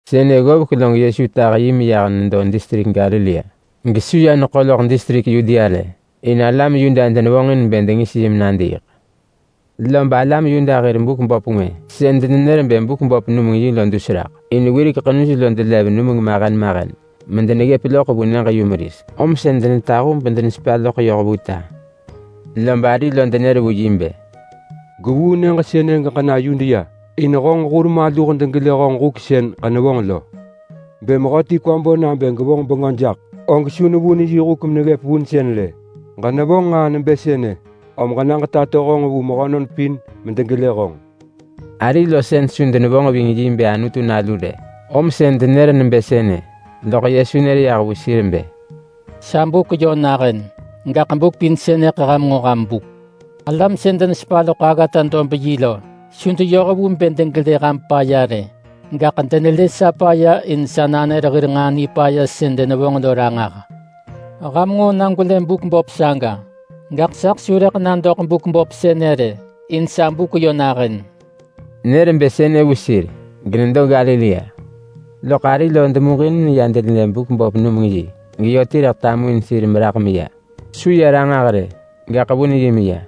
Sënë ggovek log Yesu tah yi meyah nedo distrik Galilea. Gesu ya neḳo loḳ distrik Yudea rë, in alam Yuda denevonġin bë dengis yi menadiiḳ. Lob alam Yuda hir buk vabuung ngwë sën denenër bë Buk-vabuung-numeng-yi lo dus raḳ, (in wirek ḳenuj lo delev numeng mahen mahen medeggëp loḳ vu nyëġ-yumeris, om sën denetahu bedenesepa loḳ yoh vu ta). Lob ari lo denër vu yi bë, “Gwevuu nyëġ sënë geġena Yudea in honġ hur maluh degelë honġ huk sën ġenevonġ lo. Bë mehöti kwa bo nabë gevonġ bengö jaḳ, og su nevun yi huk meneggëp vunsën rë. Ġenevonġ nġaa nebë sënë, om ġena ġetato honġ vu mehönon pin medegelë honġ.” Ari lo sën su denevonġ ving yi bë Anutu nalu rë, om sën denër nebë sënë. Lob Yesu nër yah vu sir bë, “Sa buk yö nahën! Gaḳ buk pin sënëḳ ham nġo ham buk. Alam sën denesepa loḳ aggata dob yi lo su deyoh vu bë degelë ham paya rë. Gaḳ denelë sa paya in sa nanër hir nġaa nipaya sën denevonġ lo ranġah. Ham nġo na gwelë buk vabuung saga! Gaḳ saḳ su rëḳ na doḳ buk vabuung sënë rë in sa buk yö nahën.” Nër bë sënë vu sir genedo Galilea. Loḳ ari lo demuġin meya denelë buk vabuung geyö ti rëḳ tamuin sir meraḳ meya. Su ya ranġah rë, gaḳ vun yi meya.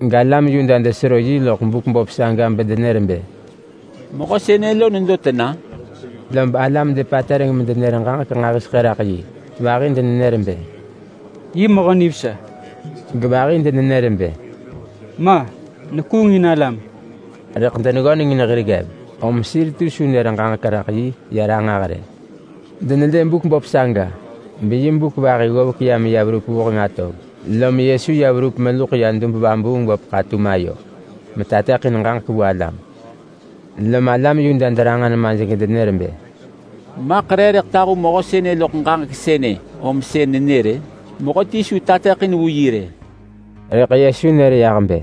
Rëḳ alam Yuda desero yi loḳ buk vabuung saga bedenër bë, “Mehö sënë lo nedo tena?” Lob alam depatereng medenër ġaġek nġahiseḳë raḳ yi. Vahi denenër bë, “Yi mehö nivesa!” Gevahi denenër bë, “Ma! Nekuungin alam!” Rëḳ deneggöneng in hir ggev, om sir ti su nër ġaġek raḳ yi ya ranġah rë. Denelë buk vabuung saga beyi buk vahi ggovek ya meya verup vuheng atov, lom Yesu ya verup meluḳ ya dub-vabuung-böp ḳatum ayo metateḳin ġaġek vu alam. Lom alam Yuda deranġa nemaj gedenër bë, “Maḳ re rëḳ tahu mehö sënë loḳ ġaġek sënë om sën nenër-ë? Mehöti su tateḳin vu yi rë!” Rëḳ Yesu nër yah bë,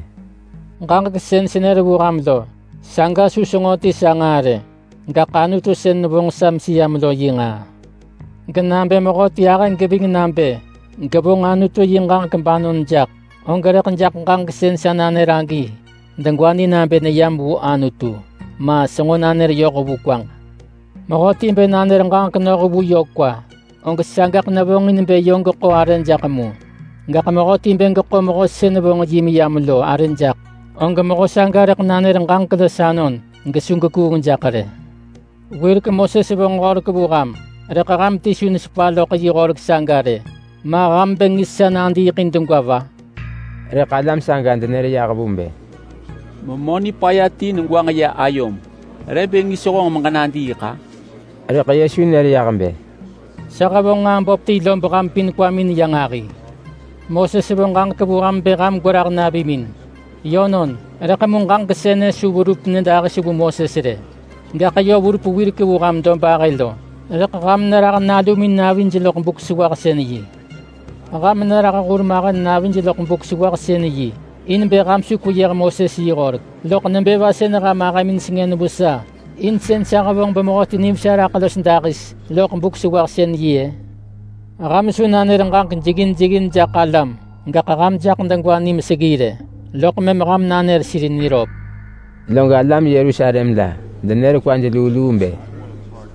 “Ġaġek sën senër vu ham lo, saga su senġo ti sa nġaa rë. Gaḳ Anutu sën nevonġ sa meseyam lo yi nġaa. Genabë mehöti ahë geving nabë gevonġ Anutu yi ġaġek banon jaḳ, og rëḳ jaḳ ġaġek sën sa nanër agi degwa ni nabë neyam vu Anutu, ma, senġo nanër yoh vu kwaġ. Mehöti bë nanër ġaġek noh vu yö kwa, og sagaḳ nevonġin bë yö geḳo arë jaḳ mu. Gaḳ mehöti bë geḳo mehö sën vonġ yi meyam lo arë jaḳ, og mehö saga rëḳ nanër ġaġek los anon gesu gekuung jaḳ rë. Wirek Moses vonġ horek vu ham, rëḳ ham ti su nesepa loḳ yi horek saga rë. Ma ham bë ngis sa nadiiḳ in degwa va?” Rëḳ alam saga denër yah vu bë, “Memö nipaya ti negwanġ ya ayom! Re bë ngis honġ nadiiḳ-a?” Rëḳ Yesu nër yah bë, “Sa hevonġ nġaa böp ti lob ham pin kwamin ya nġahi. Moses vo ġaġek vu ham bë ham gwerah navimin. Yönon, rëḳ mu ġaġek sënë su verup nyëdahis vu Moses rë, gaḳ yö verup wirek vu ham dobahë lo. Rëḳ ham nerah nalumin navij loḳ Buk-sewahsën-yi. Ham nerah hurmahen navij loḳ Buk-sewahsën-yi in bë ham su kweyëh Moses yi horek. Loḳ nebë va sën ham ahëmin sengën vu sa in sën sa hevonġ bemehöti nivesa raḳ los dahis loḳ Buk-sewahsën-yi-ë? Ham su nanër ġaġek jeggin jeggin jaḳ alam, gaḳ ham jaḳ degwa ni meseggi rë loḳ mëm ham nanër sir niröp.” Log alam Yerusalem la denër kwaj luu luu bë,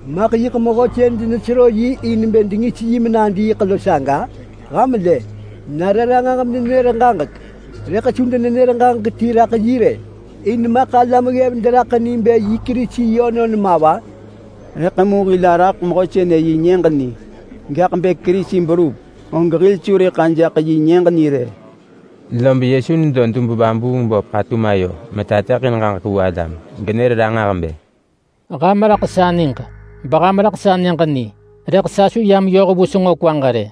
“Maḳ yiḳ mehö sën denesero yi in bë dengis yi menadiiḳ lo saga? Ham lë! Nare ranġah menenër ġaġek rëḳ su denenër ġaġek ti raḳ yi rë! In maḳ alam ggev deraḳ ni bë yi Kerisi yönon ma va? Rëḳ mu hil araḳ mehö sënë yi nyëġ ni, gaḳ bë Kerisi berup, og hil su rëḳ ajaḳ yi nyëġ ni rë!” Lob Yesu nedo dub-vabuung-böp ḳatum ayo metateḳin ġaġek vu alam, genër ranġah bë, “Ham raḳ sa niġ, beham raḳ sa nyëġ ni! Rëḳ sa su yam yoh vu senġo kwaġ rë.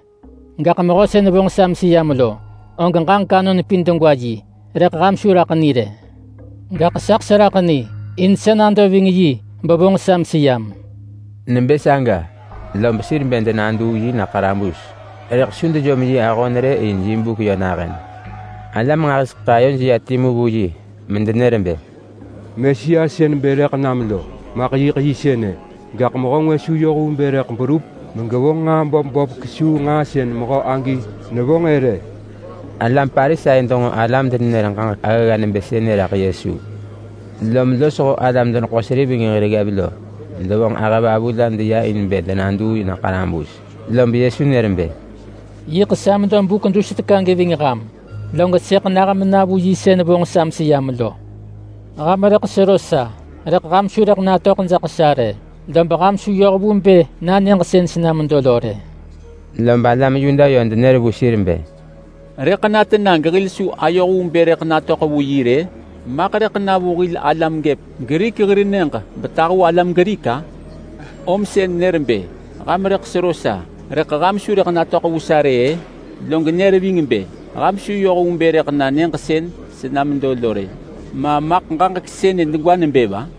Gaḳ mehö sën vonġ sa meseyam lo, og ġaġek anon pin degwa yi, rëḳ ham su raḳ ni rë. Gaḳ saḳ seraḳ ni. In sa nado ving yi bevonġ sa meseyam.” Nebë saga lob sir bë denaduu yi na ḳarabus, rëḳ su dejom yi ahon rë in yi buk yö nahën. Alam nġahiseḳë ayoj ya timu vu yi medenër bë, “Mesia sën bë rëḳ nam lo maḳ yiḳ yi sënë! Gaḳ mehö ngwë su yoh vu bë rëḳ berup megevonġ nġaa böp böp kesuu nġaa sën mehö agi nevonġ-ë rë.” Alam Parisai denġo alam denenër ġaġek aggagga nebë sënë raḳ Yesu, lom losho alam-deneḳo-seriveng hir ggev lo devonġ ahëvavu la deya in bë denaduu na ḳarabus. Lob Yesu nër bë, “Yiḳ sa medo buk dus teka geving ham, log sëḳ nah mena vu yi sën vonġ sa meseyam lo. Ham rëḳ sero sa, rëḳ ham su rëḳ natöḳ jaḳ sa rë. Lob ham su yoh vu bë na nyëġ sën sena medo lo rë.” Lob alam Yuda yö denër vu sir bë, “Rëḳ na tena gehil su ayoh vu bë rëḳ natöḳ vu yi rë? Maḳ rëḳ na vu hil alam vu alam Grik hir nyëġ betahu alam Grik-a? Om sën nër bë, ‘Ham rëḳ sero sa, rëḳ ham su rëḳ natöḳ vu sa rë’—ë? Log nër ving bë, ‘Ham su yoh vu bë rëḳ na nyëġ sën sena medo lo rë’. Ma maḳ ġaġek sënë degwa nebë va?”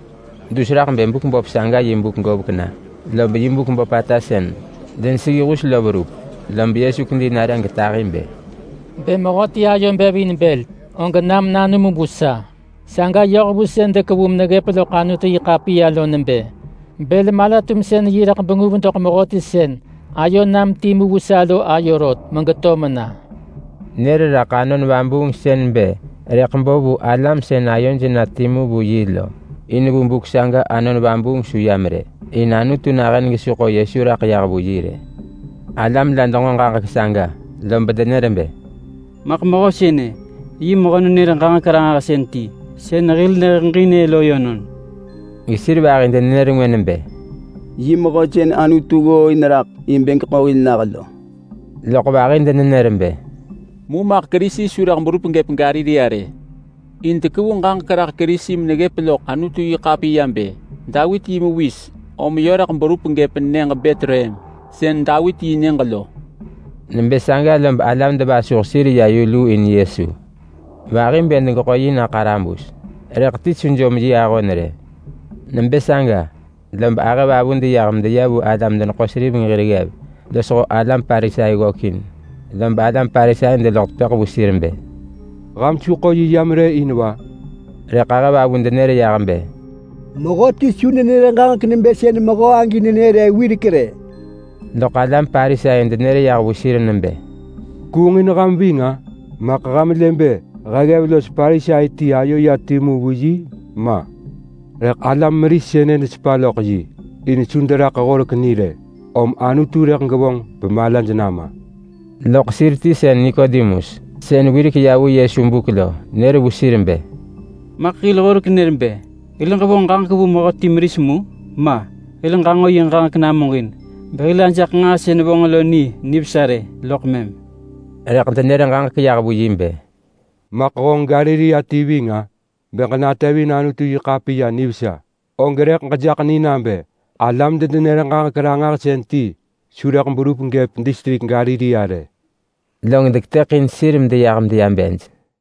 Dus raḳ bë Buk-vabuung saga yi buk govek na, lob yi buk böpata sën deneseggi hus lo verup, lob Yesu kedi nare getahi bë, “Bë mehöti ayo bev in bël, og nam nanum vu sa! Saga yoh vu sën dekevu meneggëp loḳ Anutu-yi-ḳapiya lo nebë: Bël-mala-tumsën-yi rëḳ benguv doḳ mehöti sën ayo nam timu vu sa lo ayo rot megeto mena.” Nër raḳ Anon Vabuung sën bë rëḳ bo vu alam sën ayoj na timu vu yi lo. In vu buk saga Anon Vabuung su yam rë, in Anutu nahën gesu ḳo Yesu raḳ yah vu yi rë. Alam la denġo ġaġek saga, lob denër bë, “Maḳ mehö sënë, yi Mehö-nenër-ġaġek-ranġahsën ti sën hil neheġin-ë lo yönon.” Gesir vahi denenër ngwë nebë, “Yi Mehö sën Anutu ggooin raḳ in bë geḳo hil nah lo.” Loḳ vahi denenër bë, “Mu maḳ Kerisi su rëḳ berup gëp Galilea rë! In dekevu ġaġek raḳ Kerisi meneggëp loḳ Anutu-yi-ḳapiya bë Davit yi mewis, om yö rëḳ berup gëp nyëġ Betlehem sën Davit yi nyëġ lo.” Nebë saga lob alam devasuh sir ya yu luu in Yesu. Vahi bë degeḳo yi na ḳarabus, rëḳ ti su jom yi ahon rë. Nebë saga lob ahëvavu deyah medeya vu alam-deneḳo-seriveng hir ggev losho alam Parisai ggökin. Lob alam Parisai deloḳ tepëḳ vu sir bë, “Ham su ḳo yi yam rë in va?” Rëḳ ahëvavu denër yah bë, “Mehöti su nenër ġaġek nebë sën mehö agi nenër-ë wirek rë!” Loḳ alam Parisai denër yah vu sir nebë, “Kuungin ham ving-a? Maḳ ham lë bë he ggev los Parisai ti ayo ya timu vu yi? Ma! Rëḳ alam meris sënë desepa loḳ yi in su deraḳ horek ni rë, om Anutu rëḳ gevonġ bemalaj nama.” Loḳ sir ti sën Nikodemus, sën wirek ya vu Yesu buk lo, nër vu sir bë, “Maḳ hil horek nër bë hil ġevonġ ġaġek vu mehöti meris mu? Ma! Hil ġanġo yi ġaġek namuġin, behil ajaḳ nġaa sën vonġ lo ni nivesa rë, loḳ mëm.” Rëḳ denër ġaġek yah vu yi bë, “Maḳ honġ Galilea ti ving-a? Bë ġenatevin Anutu-yi-ḳapiya nivesa, og rëḳ ġejaḳ ni nabë alam-denenër-ġaġek-ranġahsën ti su rëḳ berup gëp distrik Galilea rë.” Log deketëḳin sir medeyah medeya bej.